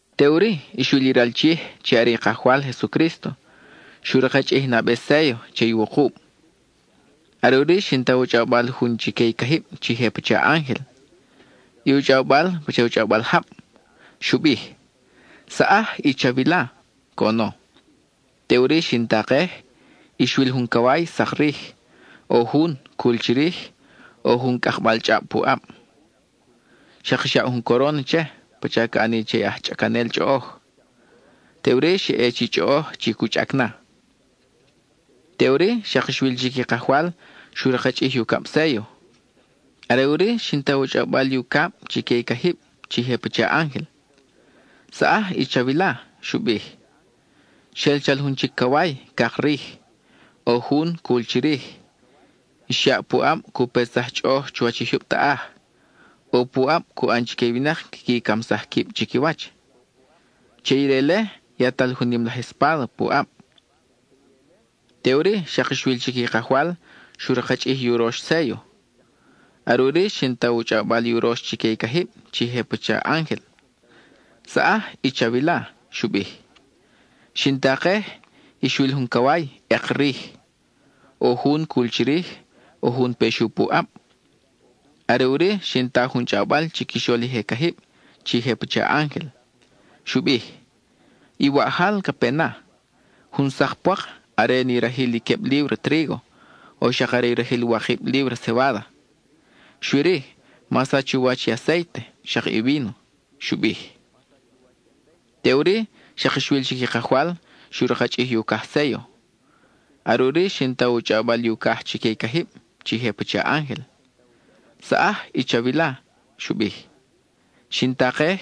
Teʼuri, xwil i ral Chij (chi are i Kajwal Jesucrísto) xu rakchʼij i nabe séllo che i wukub. Are ʼuri xin ta u chʼawbal jun chique i cajib chi je pacha ángel; i u chʼawbal pacha u chʼawbal jab. Xu bij: —¡Saʼaj y chawila! —coʼono. Teʼuri xin takej, y xwil jun caway, sak rij. ʼO jun, cul chirij, ʼo jun cʼakbal chʼab pu ʼab. Xak xyaʼ jun coron che pacha ca ʼani che i aj chʼacanel chʼoʼoj. Teʼuri, xa ʼe chi chʼoʼoj chi cu chʼac na. Teʼuri, xak xwil chic i Kajwal xu rakchʼij i ucab séllo. Are ʼuri xin ta u chʼawbal i ucab chique i cajib chi je pacha ángel. —¡Saʼaj y chawila! —xu bij. Xel chal jun chic caway, cak rij. ʼO jun, cul chirij, xyaʼ puʼab cu petsaj chʼoʼoj chuwach i jyub taʼaj; ʼo puʼab cu ʼan chique i winak quiqui camsaj quib chiquiwach. Che ire-le, yatal jun nim laj espáda pu ʼab. Teʼuri, xak xwil chic i Kajwal xu rakchʼij i urox séllo. Are ʼuri xin ta u chʼawbal i urox chique i cajib chi je pacha ángel. —¡Saʼaj y chawila! —xu bij. Xin takej, y xwil jun caway, ʼek rij. ʼO jun, cul chirij, ʼo jun pexu pu ʼab. Are ʼuri xin ta jun chʼawbal chiquixol i je cajib chi je pacha ángel. Xu bij: —I waʼjal ca pe na; jun sak pwak are ni rajil i queb líbra trígo, o xak are i rajil wakib líbra cebáda. Xui-ri, ma sach u wach i acéite, xak i víno —xu bij. Teʼuri, xak xwil chic i Kajwal xu rakchʼij i ucaj séllo. Are ʼuri xin ta u chʼawbal i ucaj chique i cajib chi je pacha ángel. —¡Saʼaj y chawila! —xu bij. Xin takej,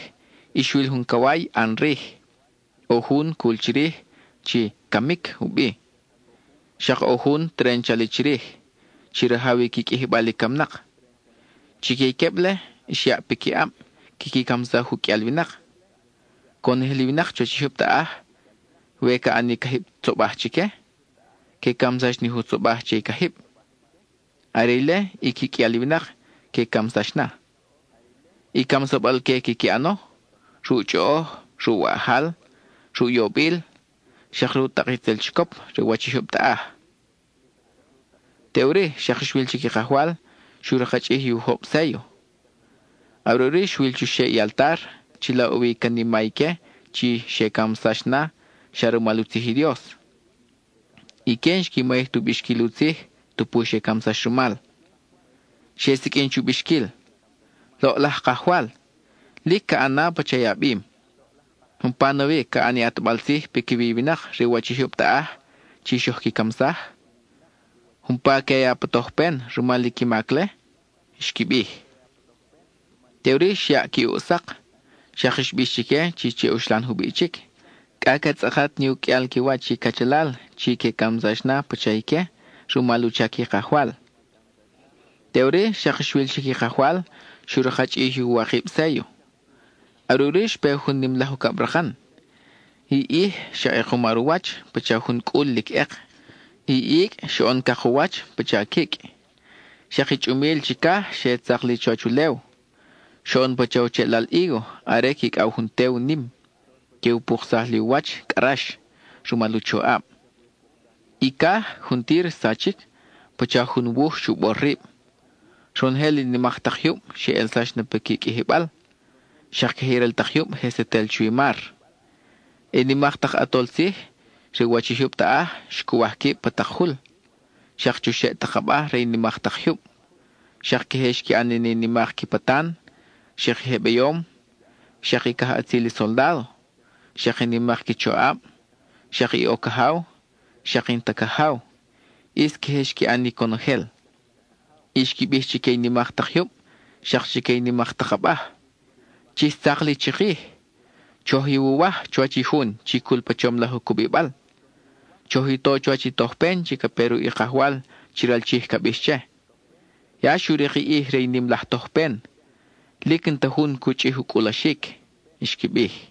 y xwil jun caway, ʼan rij. ʼO jun, cul chirij, chi “Camic” u bi. Xak ʼo jun, teren chali chirij, chi rajaw i qui qʼuijibal i camnak. Chique i queb-le, xyaʼ piquiʼab quiqui camsaj u qʼuial winak. (Conojel i winak chuwach i jyub taʼaj, we ca ʼani cajib tzobaj chique, que camsax ni jun tzobaj che i cajib. Are ile i qui qʼuial i winak que camsax na.) I camsabal-que quiqui ʼano: ruʼ chʼoʼoj, ruʼ waʼjal, ruʼ yobil, xak ruʼ tak itzel chicop re u wach i jyub taʼaj. Teʼuri, xak xwil chic i Kajwal xu rakchʼij i ujob séllo. Are ʼuri xwil chuxeʼ i altar, chila ʼo wi i canima ique chi xe camsax na xa rumal u tzij i Dios; ique n-xqui mayij tu bixquil u tzij tupu xe camsax rumal. Xe siqʼuin chu bixquil: —Loʼlaj Kajwal, lic ca ʼan na pacha i a bim. ¿Umpa nawi ca ʼan i a ʼatbal tzij piquiwi i winak re u wach i jyub taʼaj chi xoj qui camsaj? ¿Umpa que a ya pa tojpen rumal i qui mac-le? —xqui bij. Teʼuri xyaʼ qui ʼuʼ sak, xak xbix chique chi che uxlan jubiʼ chic, cʼa ca tzʼakat ni u qʼuial qui wach i cachalal chi que camsax na pacha ique rumal u chac i Kajwal. Teʼuri, xak xwil chic i Kajwal xu rakchʼij i uwakib séllo. Are ʼuri xpe jun nim laj ucabrakan; i ʼij xa ʼekumar u wach pacha jun cʼul lic ʼek; i icʼ xoʼon cak u wach pacha quicʼ, xak i chʼumil chicaj xe tzak li chuwach ulew. Xoʼono pacha u cheʼlal hígo are quicʼaw jun tew nim, que u puksaj li u wach cʼa rax, rumal u choʼab. I caj juntir xsachic pacha jun wuj xu bor rib. Ronojel i nimak ta jyub xe ʼelsax na piqui qʼuijibal, xak queje i ral tak jyub je setel chuwi mar. I nimak tak ʼatol tzij re u wach i jyub taʼaj xcuwaj quib pa tak jul, xak chuxeʼ tak abaj re i nimak tak jyub. Xak queje xqui ʼan ni nimak qui patan, xak i je beyom, xak i cajʼatzil i soldádo, xak i nimak qui choʼab, xak i ʼo cajaw, xak i n-ta cajaw; ʼis queje xqui ʼan ni conojel. Y xqui bij chique i nimak tak jyub xak chique i nimak tak abaj: —¡Chix tzak li chikij! ¡Choj iwuwaj chuwach i jun chi cul pa chom laj u cubibal! ¡Choj i to chuwach i tojpen chi ca pe ruʼ i Kajwal chi ral Chij ca bix che! Ya xu rik i ʼij re i nim laj tojpen; lic n-ta jun cu chʼij u cʼulaxic —xqui bij.